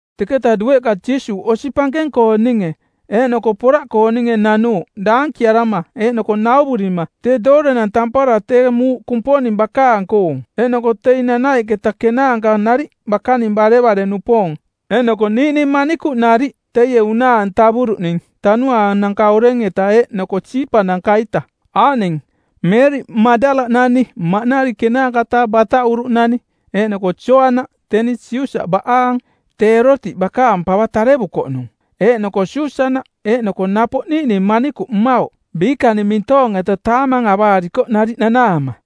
Teketa dueꞌka Jiisuuꞌ osi pankeng-kooninge eeꞌnoko poraꞌkooninge nanuuꞌ daankiarama eeꞌnoko nauvurima tee doorenang tampara tee muuꞌ Kumponing bakaang-koong; Eeꞌnoko teing nanaiꞌketa kenaanka nariꞌ, bakaning barevare-nupoong, eeꞌnoko niiꞌning manikuꞌ nariꞌ teie unaa-antavuruꞌning tanuaananka oreng-eta eeꞌnoko siipananka-ita; Aaꞌning: Meeriꞌ Maꞌdala-nani, maꞌnari ˜kenaanka-taa bataꞌuruꞌnani; eeꞌnoko Joana, teni Siusa baꞌaang, tee Eerotiꞌ bakaang pava tarevukoꞌnung; eeꞌnoko Susana eeꞌnoko napoꞌ niiꞌning manikuꞌ mmauꞌ biikaning mintoong-eta taamang avaarikoꞌ nariꞌ nanaama.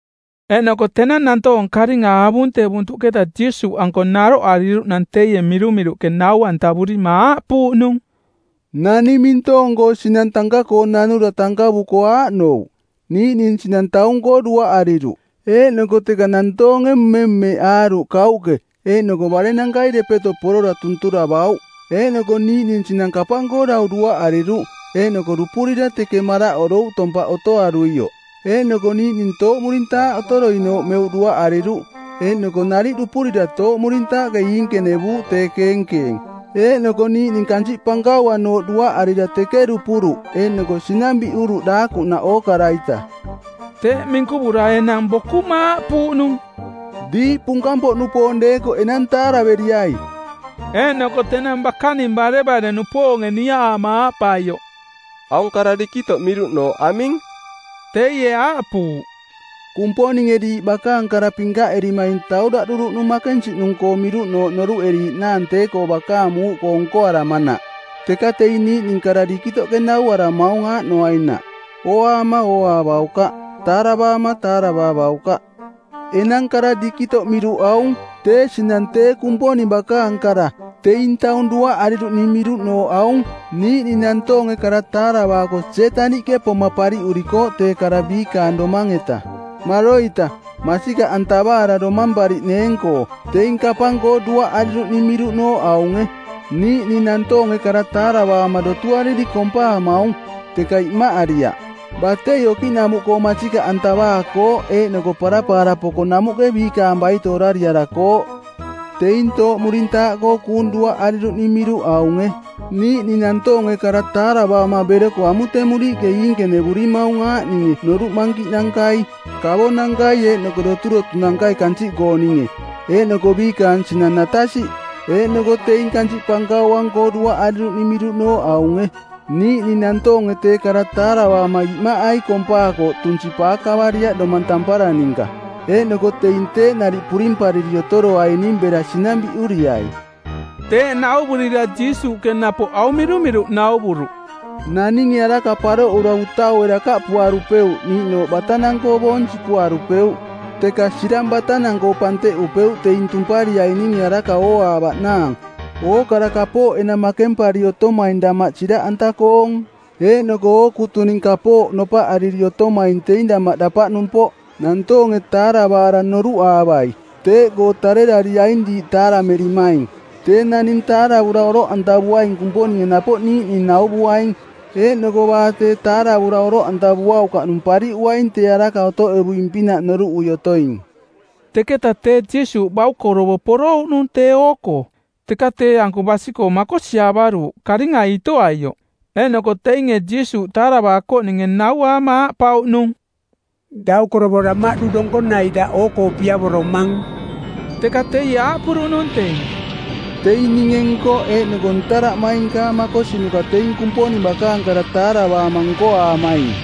Eeꞌnoko tenang nantoong karinga avuntevuntuꞌketa Jiisuuꞌanko naroꞌariruꞌnang teie mirumiruꞌke nau-antavurima aaꞌpuuꞌnung, “Naning mintoong-koo sinang tanka-koo nanura tankavuko aaꞌnouꞌ: niiꞌning sinang taung-koo duaꞌariruꞌ, eeꞌnoko teka nantoonge mmemmeꞌaaruꞌ kauꞌke eeꞌnoko barenankai depeto porora tunturavauꞌ. Eeꞌnoko niiꞌning sinang kapang-koo dau duaꞌariruꞌ eeꞌnoko dupurira teke maraꞌorouꞌ tompaꞌ otoaruioꞌ. Eeꞌnoko niiꞌning tooꞌmurintaaꞌ otoroinooꞌ meuꞌ duaꞌariruꞌ, eeꞌnoko nariꞌ dupurira tooꞌmurintaaꞌke iinkenevuuꞌ tee keenkeeng. Eeꞌnoko niiꞌning kansiꞌ pankauanooꞌ duaꞌarira teke dupuruꞌ eeꞌnoko sinang biꞌuruꞌ daakuꞌnaꞌ ookara-ita.” Teeꞌ minkuvura enang bokuma aaꞌpuuꞌnung, “Diiꞌ punkang-poꞌnupoong deekoꞌ enang taaraveriai!” Eeꞌnoko tenang bakaning barevare-nupoonge niaꞌaama aaꞌpaioꞌ, “Aung kara dikitoꞌ miruꞌnooꞌ aming?” teie aaꞌpuuꞌ, “Kumponinge diiꞌ bakaang kara pinkaꞌerimaing tauraꞌduruꞌnung makensiꞌnung-koo miruꞌnooꞌ noruꞌeriiꞌnaang tee-koo bakaang muuꞌkoo nkoaramanaꞌ, teka teing niiꞌning kara dikitoꞌ narunge nauaramaung aaꞌnoainaꞌ: ‘Ooaama ooaavaukaꞌ, taaravaama taaravaavaukaꞌ.’ “Enang kara dikitoꞌ miruꞌ aung: Tee sinang tee Kumponing bakaang kara. Teing taung duaꞌariruꞌning miruꞌnooꞌ aung: Niiꞌning nantoonge kara taaravaako Sietaniꞌke poma pariꞌurikooꞌ tee kara biikaang domang-eta, maroita, masikaꞌantavaara domampariꞌneeng-koo. Teing kapang-koo duaꞌariruꞌning miruꞌnooꞌ aunge: Niiꞌning nantoonge kara taaravaama dotuariri kompaamaung, teka imaꞌariaꞌ. Batei okiꞌnamuꞌkoo masikaꞌantavaakooꞌ eeꞌnoko parapaara poko namuꞌke biikaang baito orariarakooꞌ. Teing tooꞌmurintaaꞌkoo kuung duaꞌariruꞌning miruꞌ aunge: Niiꞌning nantoonge kara taaravaama beroko amutemuriiꞌke iinkenevurimaung aaꞌninge noruꞌ mankiꞌnankai, kavonankai eeꞌnoko doturotunankai kansiꞌkooninge. Eeꞌnoko biikaang sinang natasiꞌ. Eeꞌnoko teing kansiꞌ pankauang-koo duaꞌariruꞌning miruꞌnooꞌ aunge: Niiꞌning nantoonge tee kara taaravaama imaꞌai kompaakooꞌ tunsi paakavariaꞌ domang tampara ninka. Eeꞌnoko teing teeꞌ nariꞌ purimpariri otoroaining bera sinang biꞌuriai.” Teeꞌ nauvurira Jiisuuꞌke napoꞌ aung mirumiruꞌ nauvuruꞌ, “Naninge araka paroꞌura utaue dakaꞌpuarupeuꞌ niiꞌnooꞌ batanang-koo boong sipuarupeuꞌ, teka sirang batanang-koo panteꞌupeuꞌ teing tumpariaininge araka ooaavaꞌnaang. Ookara kapooꞌ enang makempari otomaing damaꞌ siraꞌanta-koong. Eeꞌnoko ookutuning kapooꞌ nopaꞌariri otomaing teing damaꞌ dapaꞌnumpoꞌ. Nantoonge taaravaara noruꞌaavai. Teeꞌkoo tarerariaing diiꞌ taaraverimaing. Tee naning taaravura oroꞌantavuaing Kumponinge napoꞌ niiꞌning nauvuaing, eeꞌnoko baa tee taaravura oroꞌantavuaukaꞌnung pariꞌuaing tee araka otoꞌevuing-pinaꞌ noruꞌui otoing.” Teketa teꞌ Jiisuuꞌ baukorovo porouꞌnung tee oo-koo, teka tee-anko basi-koo makosiaavaruuꞌ karingai itoaioꞌ. Eeꞌnoko teinge Jiisuuꞌ taaravaakoꞌninge nauaama aaꞌpauꞌnung: “Daukorovo damaꞌdu donkonai daꞌ oo-koo piavoromang.” Teka teie aaꞌpuruꞌnung teing, “Teing ninge nkoꞌ eeꞌnoko ntaraꞌmainkaang makosinuka teing Kumponing bakaang kara taaravaama nkoaamaing.”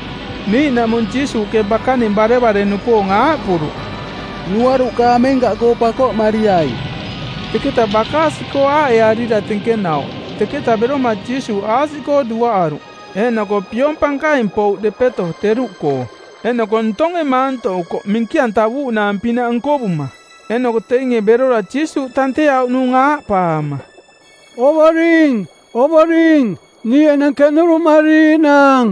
Niiꞌnaꞌmung Jiisuuꞌke bakaning barevare-nupoong aaꞌpuruꞌ, “Nuaruꞌka amenkaꞌkoo pakoꞌmariai.” Teketa bakaasi-koo aaꞌearira tenkenauꞌ. Teketa beroma Jiisuuꞌ aasiꞌkoo duaꞌaruꞌ. Eeꞌnoko piong pankaing pouꞌ depeto teruꞌkoo, eeꞌnoko ntonge maantoꞌukoꞌ minki-antavuuꞌnaang-pinaꞌ nkovuma. Eeꞌnoko teinge berora Jiisuuꞌ tanteauꞌnung aaꞌpaama, “Ovoring, Ovoring, niiꞌ enang keꞌnuruꞌmariiꞌnaang!”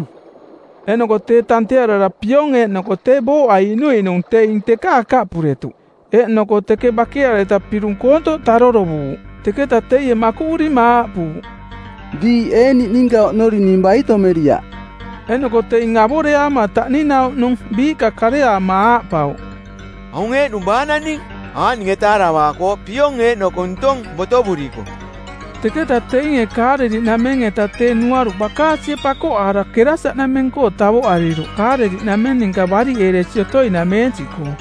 Eeꞌnoko tee tantearara piong eeꞌnoko tee booꞌa iꞌnuiꞌnung teing teka akaꞌpuretuꞌ, eeꞌnoko teke bakeareta pirung koontoꞌ tarorovuuꞌ. Teketa teie makuꞌurima aaꞌpuuꞌ, “Diiꞌ ee niꞌninka oꞌnori ning baitomeriaꞌ?” Eeꞌnoko teing avoreaama taꞌninauꞌnung biiꞌka kareaama aaꞌpauꞌ, “Aung eeꞌnung baa naning? Aaꞌninge taaravaakooꞌ: piong eeꞌnoko ntong botovuriko.” Teketaꞌ teinge Kaaleliꞌnameng-eta tee nuaruꞌ bakaasie pakoꞌaara Kerasaꞌnameng-koo tavoꞌariruꞌ Kaaleliꞌnameng ninka bariꞌeeresi otoinameensiꞌkoo.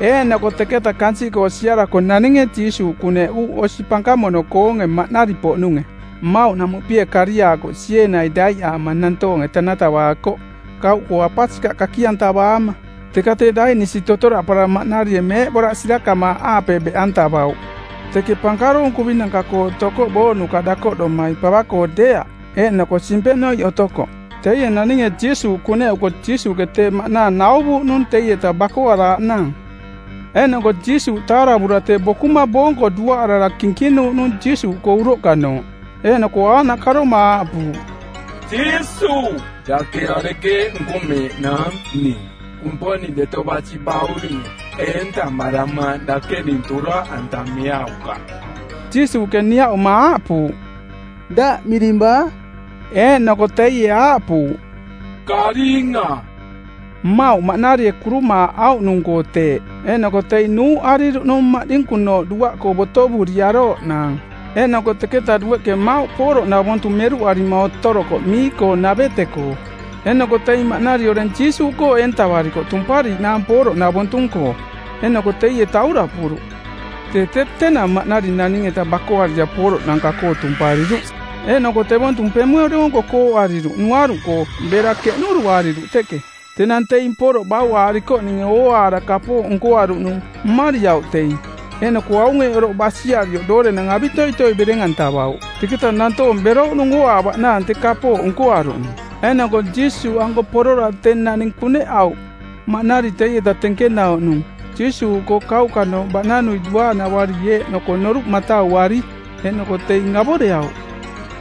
Eeꞌnoko teketa kansiꞌkoo siarako naninge Jiisuuꞌ kuneꞌuuꞌ osi pankamono-koonge maꞌnari-poꞌnunge. Mmauꞌ namuꞌpie koriaakoꞌ. Sieenai daiꞌaama nantoonge tanatavaakoꞌ, kauꞌkoo apasikaꞌ kaki-antavaama; Teka tee daiꞌnisi totoraꞌpaara maꞌnarie meeꞌboraꞌ sirakamaaꞌaape beꞌantavauꞌ. Teke pankaroong kuvinanka-koo otokoꞌ booꞌnuka dakoꞌdomai, pava-koo deeaꞌ, eeꞌnoko simpenoiꞌ otokoꞌ. Teie naninge Jiisuuꞌ kuneꞌuko Jiisuuꞌke tee maꞌnaang nauvuuꞌnung teieta bakoaraaꞌnaang; Eeꞌnoko Jiisuuꞌ taaravura tee bokuma boonko duaꞌarara kinkinuuꞌnung Jiisuuꞌkoo uroꞌkanooꞌ, eeꞌnoko aaꞌnaꞌ karoma aaꞌpuuꞌ, “Jiisuuꞌ, dake arekeeꞌ nkomeeꞌnaang ning, Kumponing Deto Basi Bauringe? Eentamaramaang dake ning toraꞌantameaukaꞌ.” Jiisuuꞌke niaꞌuma aaꞌpuuꞌ, “Daꞌ miring baa?” Eeꞌnoko teie aaꞌpuuꞌ, “Karinga.” Mmauꞌ maꞌnarie kurumaaꞌauꞌnung-koo teeꞌ. Eeꞌnoko teing nuuꞌariruꞌnung maꞌdinku˜nooꞌ duaꞌkoo botovuriarooꞌnaang. Eeꞌnoko teketa dueꞌke mmauꞌ pooroꞌnavontu meruꞌarima otorokoꞌ mii-koo navete-koo. Eeꞌnoko teing maꞌnari oreng Jiisuuꞌkoo eentavarikoꞌ tumpariiꞌnaang pooroꞌnavontu-koo. Eeꞌnoko teie tauraꞌpuruꞌ. Tee tee tenang maꞌnari naning-eta bakoarira pooroꞌnanka-koo tumpariruꞌ, eeꞌnoko tevontu pemue doonko kooꞌariruꞌ nuaruꞌkoo bera keꞌnuruꞌariruꞌ teke. Tenang teing pooroꞌ bauꞌaarikoꞌninge ooaara kapooꞌ nkoaruꞌnung, mmariauꞌ teing, eeꞌnoko aung eeꞌ oroꞌ basiarioꞌ doorenang avitoitoi bereng-antavauꞌ. Teketa nantoong berouꞌnung ooaavaꞌnaang tee kapooꞌ nkoaruꞌnung. Eeꞌnoko Jiisuuꞌanko porora tee naning kuneꞌauꞌ maꞌnari teieta tenkenauꞌnung Jiisuuꞌkoo kauꞌkanooꞌ baꞌnanuioꞌ duaanavari eeꞌnoko noruꞌ matauari. Eeꞌnoko teing avoreauꞌ.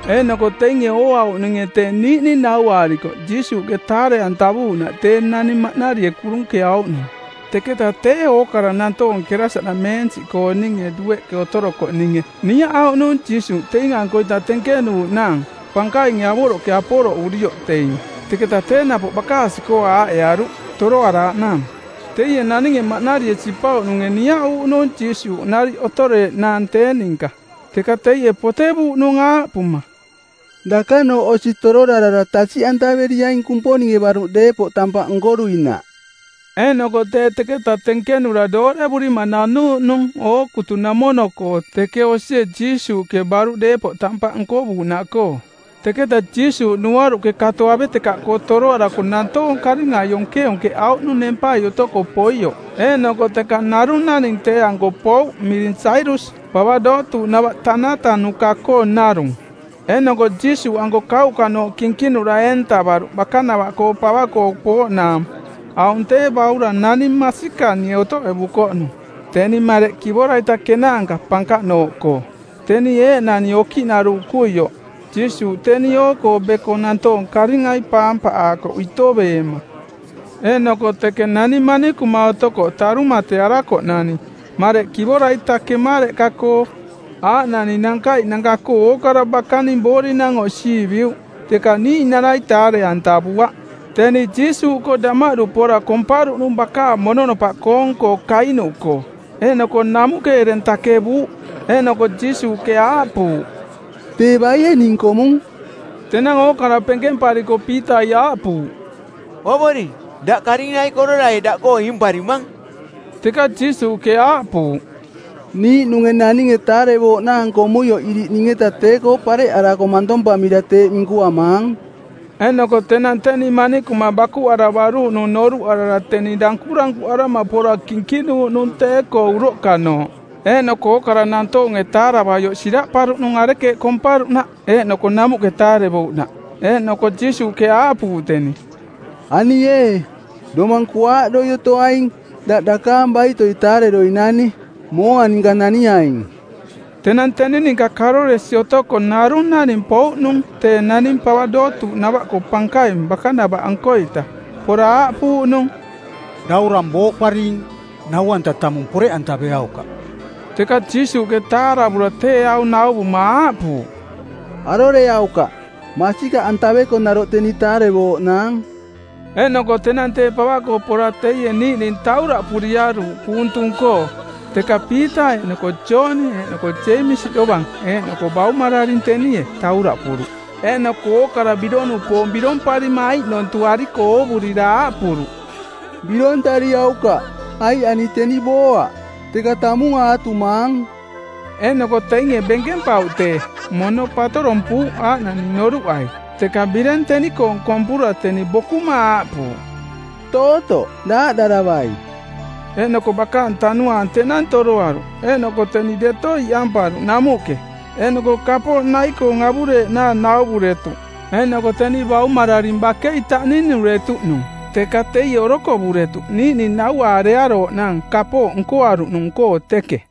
Eeꞌnoko teinge ooauꞌninge tee niiꞌning nauaarikoꞌ Jiisuuꞌke taare-antavuuꞌnaꞌ tee naning maꞌnarie kurunkeauꞌnung. Teketa tee ookara nantoonge Kerasaꞌnameensiꞌkooninge dueꞌke otorokoꞌninge niaꞌauꞌnung Jiisuuꞌ teing-ankoita tenkenuuꞌnaang pankainge avoroꞌke aporoꞌurioꞌ teing. Teketa tee napoꞌ bakaasi-koo aaꞌearuuꞌ toroaraaꞌnaang. Teie naninge maꞌnarie sipauꞌnunge niaꞌuuꞌnung Jiisuuꞌ nariꞌ otoreeꞌnaang tee ninka, teka teie potevuuꞌnung aaꞌpuma, “Dakanooꞌ osi tororarara tasiꞌantaveriaing Kumponinge baruꞌ deepoꞌ tampaꞌ nkoruinaꞌ.” Eeꞌnoko tee teketa tenkenura doorevurima nanuuꞌnung ookutunamono-koo teke osie Jiisuuꞌke baruꞌ deepoꞌ tampaꞌ nkovuuꞌnaꞌkoo. Teketa Jiisuuꞌ nuaruꞌke kato avetekaꞌkoo toroarako nantoong karingai onkeonkeꞌauꞌnung nempai otoko poioꞌ. Eeꞌnoko teka narung naning tee-anko pouꞌ miring Jairus, pava dootuuꞌnava tanatanuka-koong narung, eeꞌnoko Jiisuuꞌanko kauꞌkanooꞌ kinkinura eentavaruꞌ bakanava-koo pava-koo pooꞌnaang. Aung tee baurang nani masikani otoꞌevukoꞌnung, teni mareꞌ kivora-ita kenaanka pankaꞌnooꞌkoo, teni eeꞌnani okiꞌnaruuꞌkuioꞌ. Jiisuuꞌ teni oo-koo beko nantoong karingai paampaꞌaakoꞌ itoveema. Eeꞌnoko teke nani manikuma otokoꞌ tarumatearakoꞌnani mareꞌ kivora-ita kemareꞌka-koo, aaꞌnani nankaiꞌnanka-koo ookara bakaang boorinang oꞌsiiviuꞌ, teka niiꞌnarai taare-antavuaꞌ. Teni Jiisuuꞌkoo damaꞌdu pora komparuꞌnung bakaang mononopaꞌkoong-koo kainuꞌkoo, eeꞌnoko namuꞌke ereng takevuuꞌ. Eeꞌnoko Jiisuuꞌke aaꞌpuuꞌ, “Tee baie ning komung?” Tenang ookara penkempariko Piitai aaꞌpuuꞌ, “Ovoring, daꞌ karingai kororai daꞌkoo iimparimang.” Teka Jiisuuꞌke aaꞌpuuꞌ, “Niiꞌnunge naninge taarevooꞌnaang komuioꞌ iriꞌ ning-eta tee-koo pareꞌarako mantompamira teeꞌ minkuamaang.” Eeꞌnoko tenang teni manikuma bakuꞌaravaruuꞌnung noruꞌarara teni dankurankuꞌarama pora kinkinuuꞌnung tee-koo uroꞌkanooꞌ, eeꞌnoko ookara nantoonge taaravaioꞌ siraꞌparuꞌnung arekeeꞌ komparuꞌnaꞌ eeꞌnoko namuꞌke taarevouꞌnaꞌ. Eeꞌnoko Jiisuuꞌke aaꞌpuuꞌ teni, “Ani ee, domang kuaaꞌdoi otoaing. Daꞌ dakaang baitoi taareroinani. Mooa ninka naniaing.” Tenang teni ninka karoresi otoko narung naning pouꞌnung tee naning pava dootuuꞌnava-koo pankaing bakanava-ankoita. Pora aaꞌpuuꞌnung, “Daurang booꞌparing. Nau-anta tamung poreꞌantaveaukaꞌ.” Teka Jiisuuꞌke taaravura tee aung nauvuma aaꞌpuuꞌ, “Aroreaukaꞌ, masikaꞌantaveko naroꞌ teni taarevooꞌnaang.” Eeꞌnoko tenang tee pava-koo pora teie niiꞌning tauraꞌpuriaruuꞌ kuung tung-koo, teka Piita eeꞌnoko Jooni eeꞌnoko Jeemisi dovang eeꞌnoko baumararing tenie tauraꞌpuruꞌ. Eeꞌnoko ookara birong-nupoong biromparima aiꞌnontuꞌariko oovurira aaꞌpuruꞌ, “Birontariaukaꞌ, aiꞌ ani teni booaꞌ, teka tamung aatumaang.” Eeꞌnoko teinge benkempauꞌ tee, mono patorompuuꞌ aaꞌnani noruꞌai. Teka bireng teni-koong kompura teni bokuma aaꞌpuuꞌ, “Tootoꞌ daaꞌdaravai.” Eeꞌnoko bakaang tanuaang tenang toroaruꞌ eeꞌnoko teni deto iꞌamparuꞌ namuꞌke. Eeꞌnoko kapooꞌ nai-koong avureeꞌnaang nauvuretuꞌ. Eeꞌnoko teni baumararing bakei taꞌninuretuꞌnung, teka teie orokovuretuꞌ niiꞌning nauaarearooꞌnaang kapooꞌ nkoaruꞌnung-koo teke.